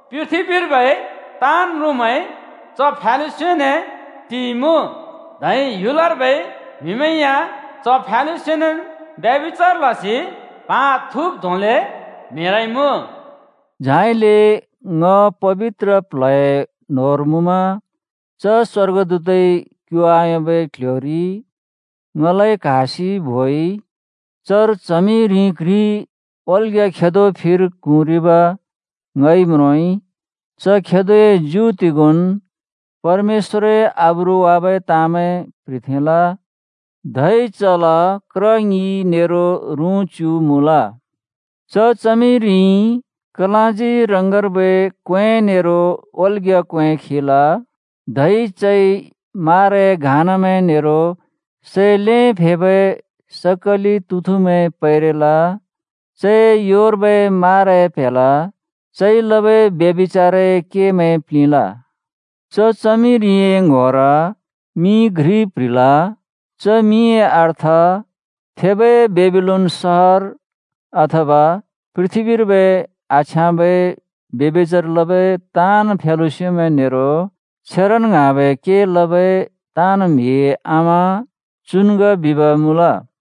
पृथ्‍बीर्बै ताँन् म्रुँमैं च फ्यालुस्योने टिइमुँ। धै ह्‍युलर्बै म्‍हिमैं या च फ्यालुस्योनेन् ब्यभिचार लसि प्हा थुँब् धोंले म्हेरइमुँ।” झाइले ङ पबित्र प्ल्हए न्होंर मुँमा च स्‍वर्गदूतइ क्यु आयोंबै क्ल्ह्‍योरि ङलाइ क्‍हासि बोइ। चर च्हमिरि घ्रि ओल्‍ग्‍या खेदो फिर क्हुँरिब् ङइ म्रोंइ। च खेदोए ज्यु तिगोंन् परमेश्‍वरए आब्रु वाबै ताँमैं प्‍ह्रिथेंल, धै चल क्र ङि नेरो रुँ च्‍यु मुँल। च च्हमिरिइ कलाँजी रङर्बै क्‍वें नेरो ओल्‍ग्‍या क्‍वें खिल, धै चइ माराए घानामैं नेरो सै ल्हें फेबै सकलि तुथुमैं पैरेल। चए योर्बै माराए प्‍हेल चइ लबै ब्यभिचारए केमैंइ प्‍लिंल। च च्हमिरिए ङ्‌होर मिं घ्रि प्‍ह्रिल। च मिंए अर्थ “थेबै बेबिलोन सहर, अथवा पृथ्‍बीर्बै आछ्याँबै ब्यभिचार लबै ताँन् फ्यालुस्योमैं नेरो छेरन ङ्हाँबै के लबै ताँन् म्‍हिए आमा चुन् ग बिब् मुँल।”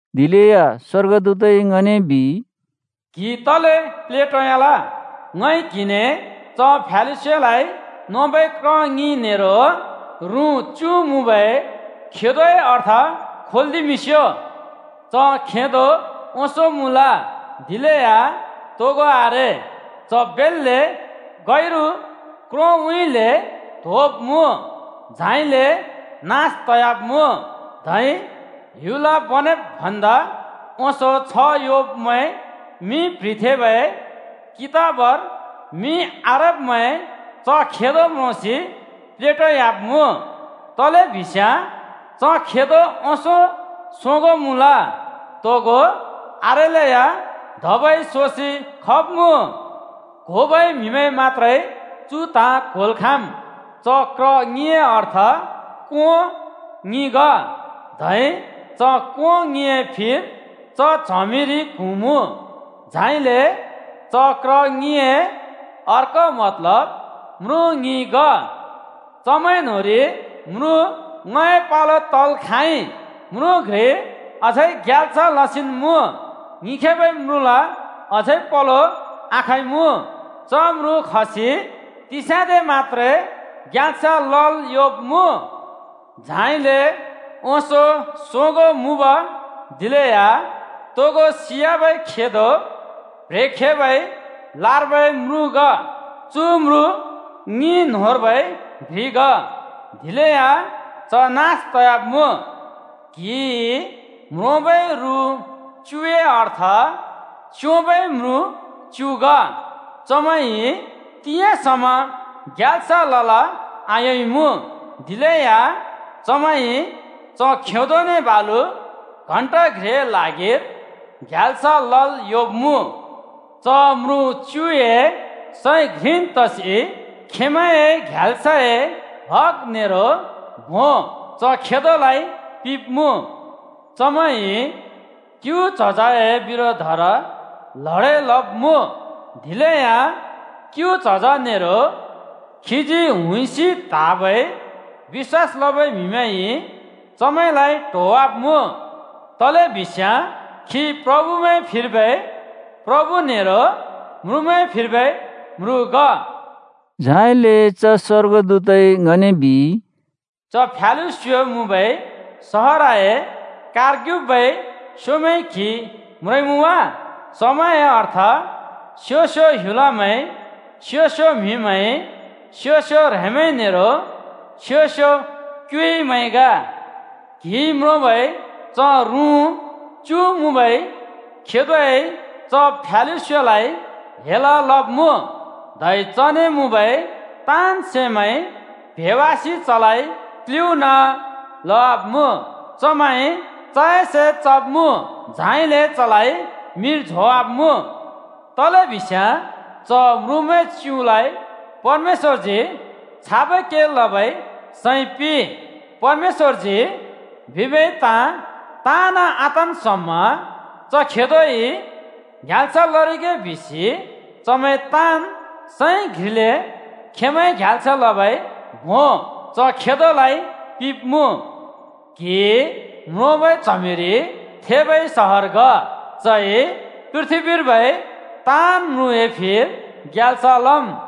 दिलेया स्‍वर्गदूतइ ङने बिइ, “क्‍हि तले प्लेटोयाल? ङइ क्हिने च फ्यालुस्योलाइ नोबै क्र ङि नेरो रुँ च्‍यु मुँबै खेदोए अर्थ खोल्‍दिमिंस्‍यो। च खेदो ओंसों मुँल, दिलेया तोगो आरे। च बेल्‍ले गैरु क्रोंउँइँले त्होंब्मुँ, झाइले नास तयाब्‍मुँ। धै ह्‍युल बनेब् भन्दा ओंसों छ्ह योंब्‍मैंए मिं प्‍ह्रिथेंबै कितबर मिं आरेब्मैं च खेदो म्रोंसि प्लेटोयाब्‍मुँ। तलेबिस्याँ च खेदो ओंसों सोगों मुँल, तोगो आरेलेया धबै सोसि खब्मुँ। “क्होबै म्हिमैंइ मत्‍त्रे चु ताँ क्‍होल् खाँम्: च क्र ङिए अर्थ कों ङि ग, धै च कों ङिए फिर च च्हमिरि क्हुँमुँ। झाइले च क्र ङिए अर्को मतलब म्रुँ ङि ग। चमैं न्होंरि म्रुँ ङ्‌हए पलो तल् खाँइ, म्रुँ घ्रिइ अझै ग्याल्स लसिन् मुँ, ङिखेबै म्रुँल अझै पलो आखइमुँ। च म्रुँ खसि तिस्याँदे मत्‍त्रे ग्याल्स लल् योंब्‍मुँ। झाइले ओंसों सोगों मुँब दिलेया तोगो सियाबै खेदो प्ह्रेखेबै लार्बै म्रुँ ग। चु म्रुँ ङि न्‍होंर्बै घ्रि ग, दिलेया च नास तयाब्‍मुँ। “क्‍हिइ म्रोंबै रुँ च्‍युए अर्थ च्‍योंबै म्रुँ च्‍यु ग। चमैंइ तिंयाँ समा ग्याल्स लल् आयोंइमुँ, दिलेया चमैंइ च खेदोने बालु घण्टा घ्रिए ल्हागिर ग्याल्स लल् योंब्‍मुँ। च म्रुँ च्‍युए सैं घ्रिन् तसि खेंमैंए ग्याल्सए हग नेरो भों च खेदोलाइ पिंब्मुँ। चमैंइ क्‍यु च्हजए बिरोधर ल्हडें लब्‍मुँ। दिलेया क्‍यु च्हज नेरो खीजी हुइसि त्‍हाँबै बिश्‍वास लबै म्‍हिमैंइ चमैंलाइ ट्होवाब्‍मुँ, तलेबिस्याँ खी प्रभुमैंए फिर्बै प्रभु नेरो म्रुँमैंए फिर्बै म्रुँ ग।” झाइले च स्‍वर्गदूतइ ङने बिइ, “च फ्यालुस्यो मुँबै सहरए कारर्ग्युबै स्योंमैं क्‍हिइ म्रोंइमुँ वा? चमैंए अर्थ स्यो-स्यो ह्‍युलमैं, स्यो-स्यो म्‍हिमैं, स्यो-स्यो ह्रेंमैं नेरो स्यो-स्यो क्युइमैं ग। क्‍हिइ म्रोंबै च रुँ च्‍यु मुँबै खेदोइ च फ्यालुस्योलाइ हेल लब्मुँ, धै चने मुँबै ताँन् सैमैं प्हेंवासि चलाइ क्‍लुना लवाब्‍मुँ। चमैंइ चए से चब्‍मुँ, झाइले चलाइ मिर झोंवाब्‍मुँ। तलेबिस्याँ च म्रुँमैं च्‍युलाइ परमेश्‍वरजी छाबै के लबै सैं पिंइ: परमेश्‍वरजी बिबै ताँ ताँन् आतन् समा च खेदोइ ग्याल्स लरिगे बिसि चमैंइ ताँन् सैं घ्रिले खेंमैंए ग्याल्स लबै भों च खेदोलाइ पिंब्मुँ। “क्‍हिइ म्रोंबै च्हमिरि थेबै सहर ग, चइ पृथ्‍बीर्बै ताँन् म्रुँए फिर ग्याल्स लम्।”